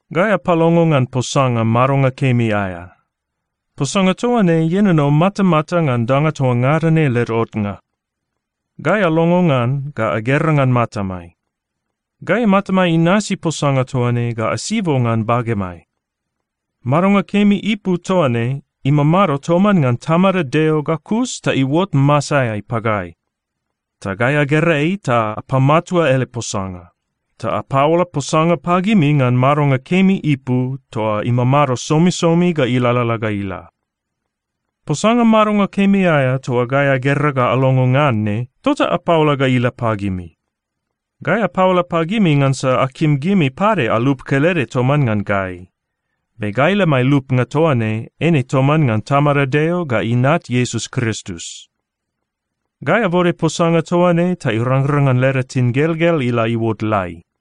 Gai apalongo ngan Posanga madonga kemi aea. Posanga toa ne ienono matamata ngan danga toa ngada ne led otnga. Gai alongo ngan ga agera ngan matamai. Gai matamai inasi Posanga toa ne ga asibo ngan bagemai. Madonga kemi ipu toa ne imamado toman ngan Tamada Deo ga kus ta iuot masaeai pagai. Ta gai agera ei ta apamatua ele posanga. Ta apaola posanga pagimi ngan madonga kemi ipu toa imamado somisomi ga ilalala ga ila. Posanga madonga kemi aea toa gai agera ga alongo ngan ne, tota apaola ga ila pagimi. Gai apaola pagimi ngansa akim gimi pade alup kelede toman ngan gai. Be gai lemai lupnga toa ne eine toman ngan Tamada Deo ga Inat Iesus Kristus. Gai abode posanga toa ne ta irangrang ngan leda tingelgel ila iuot lai.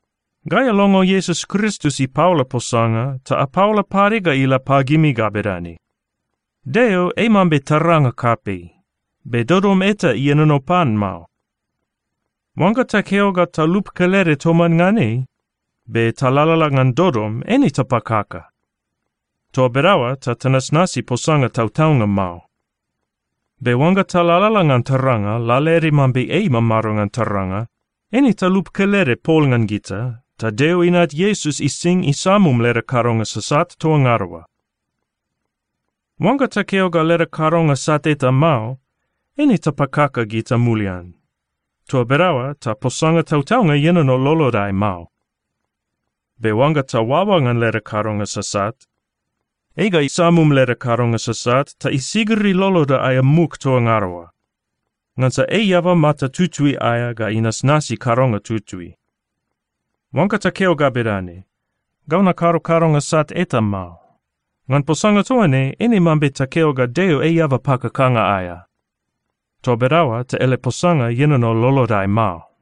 Gai alongo Iesus Kristus ipaola posanga, ta apaola pade ga ila pagimi ga bedane: Deo ei mambe taranga kapei. Be dodom eta ienono pan mao. Oangga takeo ga talup kelede toman ngan ei, be talalala ngan dodom, eine tapakaka. Toa bedaoa ta tanasnasi posanga tautaunga mao. Be oangga talalala ngan taranga, lalaede mambe ei imamado ngan taranga, eine talup kelede pol ngan gita, ta Deo Inat Iesus ising isamum leda kadonga sasat toa ngada oa. Oangga takeo ga leda kadonga sat eta mao, eine tapakaka gita mulian. Toa bedaoa ta posanga tautaunga ienono lolodai mao. Be oangga taoaoa ngan leda kadonga sasat, ei ga isamum leda kadonga sasat ta isigiri loloda aea muk toa ngada oa, ngansa ei eaba mata tutui aea ga inasnasi kadonga tutui. Oangga takeo ga bedane, “Gau nakado kadonga sat eta mao,” ngan posanga toa ne, eine mambe takeo ga Deo ei eaba pakakanga aea. Toa bedaoa ta ele posanga ienono lolodai mao.